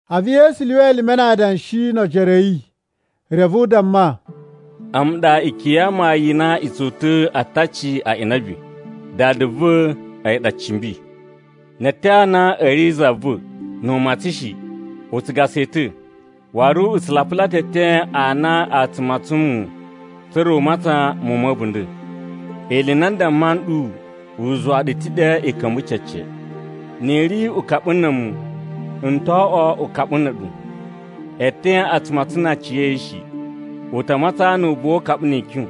A̱vu Yesu lyuwa elime na adanshi no ojoro a̱ yi, reve u damma, “A̱mu ɗa ikyun ya amayun i na i tsu uta̱a̱ ataci a inabi. Dada va̱ a̱yi ɗa cimbi. Ne eeten a na a̱ ri za va̱ nu u matsan shi, u tsu gasa yi ta̱. Waru u tsu lapula ta̱ eeten a na a tsu matsan muwun, tsa̱ra̱ u matsan muwun ma̱ a̱bunda̱. Ili i na n damma nɗu u zuwa ɗu ta̱ ɗe i ka̱mba̱ cece. Ni i ri ukaɓu na̱ a̱mu, n to oꞌwo ukaɓu na̱ a̱ɗu. Eeten a tsu matsan na aciya̱yi shi. U ta matsan nu u buwa ukaɓu ni ikyun.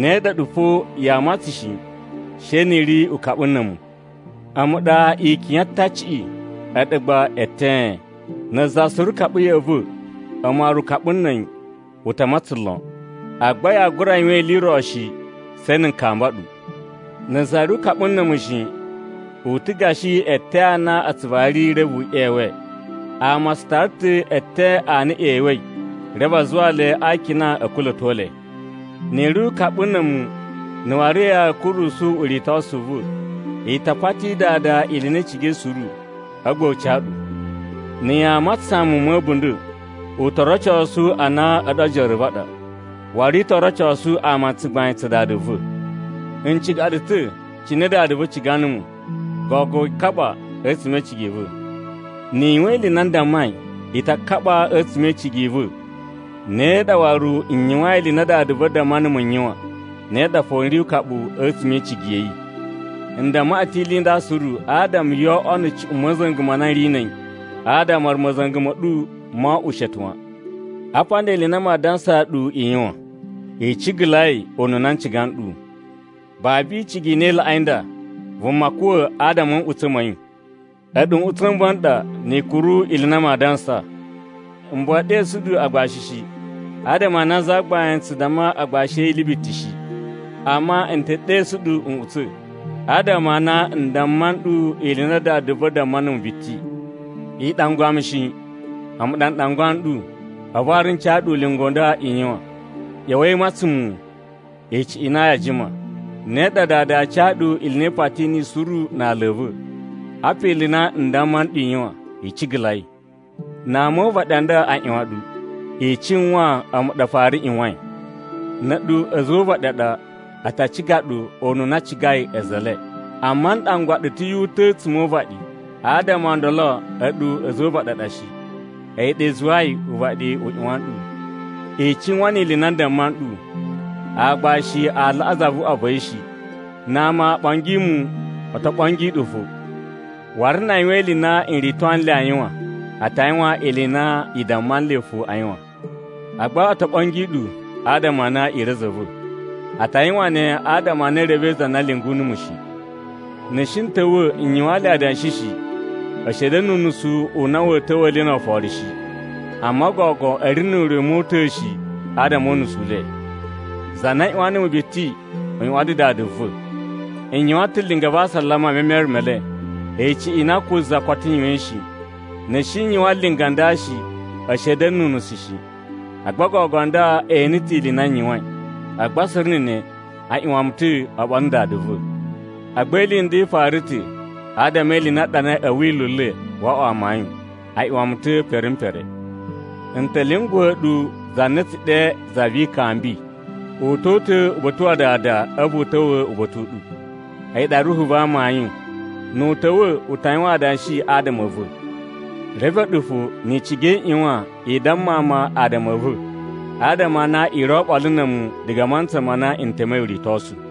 Ne ɗa a̱ɗu fo yaa matsan shi, she ni i ri ukaɓu na̱ a̱mu. “A̱mu ɗa ikyun ya ataciꞌi, a̱ɗu gba eten. Na̱ za suru kaɓa ya̱ꞌa̱ va̱, a̱mu waru ukaɓu na̱ a̱yi, u ta̱ matsan lon. Agba yaa gura yuwan ili i ro shi, she na̱ n kamba ɗu. Na̱ za ri ukaɓu na̱ a̱mu shi, u ta̱ gashi eeten a na a tsu vari reve u ꞌyewe. Ama a tsu tara ta̱ eten a na e ꞌyewei, reve a zuwa le a akina a̱ kula̱to le. Ni i ri ukaɓu na̱ a̱mu na̱ waru ya̱a̱ kurusu uritosu u va̱, i ta pati Dada ili i na i cigai suru, a̱vu gba u ca ɗu. Na̱ yaa matsasan muwun ma̱ a̱bunda̱, u to rocosu a na a̱ɗu ojoro a̱ va̱ a ɗa, waru i to rocosu ama tsugbain tsa Dada va̱. “N ciga ɗu ta̱ cine Dada va̱ ciga numu. Gogo i kaɓa a̱tsuma̱ e icigi i va̱. Ni i yuwan ili i na n dammai, i ta kaɓa a̱tsuma̱ e icigi i va̱. Ne ɗa waru, n yuwain ili i na Dada va̱ damma numu n yuwan, ne ɗa fo n ri ukaɓu a̱tsuma̱ e icigi ya̱ yi. N damma ɗu ta̱ ili i nda suru adama yoo oꞌwo na̱ cuꞌun ma̱za̱nga̱ ma na n ri na̱ a̱yi, adama waru ma̱za̱nga̱ ma̱ ɗu mo oꞌwo ushete wan. Apa nda ili i na maa dansaa ɗu i yuwan: i cigalai ununa n ciga nɗu. Babu icigi i na i laꞌai nda, vuma kuwa̱ adama a̱ nꞌutsa̱ ma̱ yi. “A̱ɗu nꞌutsa̱ n va̱ ɗa, ni i kuru ili i na maa dansa. M buwa e ɗesu ɗu agbashi shi, adama a na zagbain tsu damma agbashi a̱ yi ili biti shi. Amma n te ɗesu ɗu nꞌutsa̱, adama a na n damma nɗu ili i na Dada va̱ damma numu biti. I ɗangwa mu shi. A̱mu ɗa n ɗangwa nɗu. A̱vu waru n ca ɗu ulinga u nda i yuwan: ꞌYa̱wa̱i i matsan muwun, icuꞌun i na yaa jima. Ne ɗa Dada aa ca ɗu ili i na i pati niyi suru na ala a̱ va̱. Apa ili i na n damma nɗu i yuwan: I cigalai. “Na ama o uvaɗi a nda a ꞌyuwan ɗu, i cuwan a̱mu ɗa a fara ꞌyuwain. Na̱ a̱ɗu a̱za̱ o uvaɗi a ɗa, a ta ciga ɗu ununa a cigai a̱za̱ e le. Amma n ɗangwa ɗu ta̱ yu uta̱ a̱tsuma̱ o uvaɗi, adama o ndolo a̱ɗu a̱za̱ o uvaɗi a ɗa shi. A̱yi ɗa i zuwai uvaɗi u ꞌyuwan nɗu. I cuwan ni ili i na n damma nɗu: Aagbashi a laꞌa zavuꞌwa va̱ yi shi. Na ama o ɓongi mu, o to ɓongi ɗu fo. Waru na a yuwan ili i na n rito nle a yuwan, a ta yuwan ili i na i damma nle fo a yuwan. Agba o to ɓongi ɗu adama a na i ri a̱za̱ a̱ va̱. A ta yuwan ne adama a na e revei za na lyungu numu shi. Na̱ n shi n ta̱wa̱ n yuwaan le adanshi shi, a̱ shi a̱ da̱na̱ nu unusu u na wa̱a̱ ta̱wa̱a̱ le no oforo shi. Amma gogo a̱ ri nu ure u mota̱a̱ shi adama o unusu u le. Za na ꞌyuwan numu biti u ꞌyuwan ta̱ Dada va̱. N yuwan ta̱ linga va asalama e memere me le, icuꞌun i na ko za koto yuwain shi. Na̱ n shi n yuwan linga nda shi, a̱ shi a̱ da̱na̱ nu unusu shi. Agba gogo nda e ene ta̱ ili i na n yuwain. Agba suru na̱ ne, a ꞌyuwan mu ta̱ oɓolo na̱ Dada va̱. Agba ili i nda i fara ta̱ adama e ili i na a ɗanai a̱ Wila̱ u le wo oꞌwo amayun: ‘A ꞌyuwan mu ta̱ pere m pere.’ “N ta̱ lyunguwa̱ ɗu za na a̱ tsu ɗe Za vi Ikambi. U to uta̱ uba̱ta̱ wa Dada a̱vu u ta̱wa̱ uba̱ta̱ u ɗu. A̱yi ɗa Ruhu va amayun. Nu u ta̱wa̱, u ta yuwan adanshi adama a̱ va̱. Reve a̱ɗu fo ni i ciga i ꞌyuwan i damma ama adama a̱ va̱, adama a na i ri oɓolo na̱ a̱mu diga a mantsa ma na n temei uritosu.”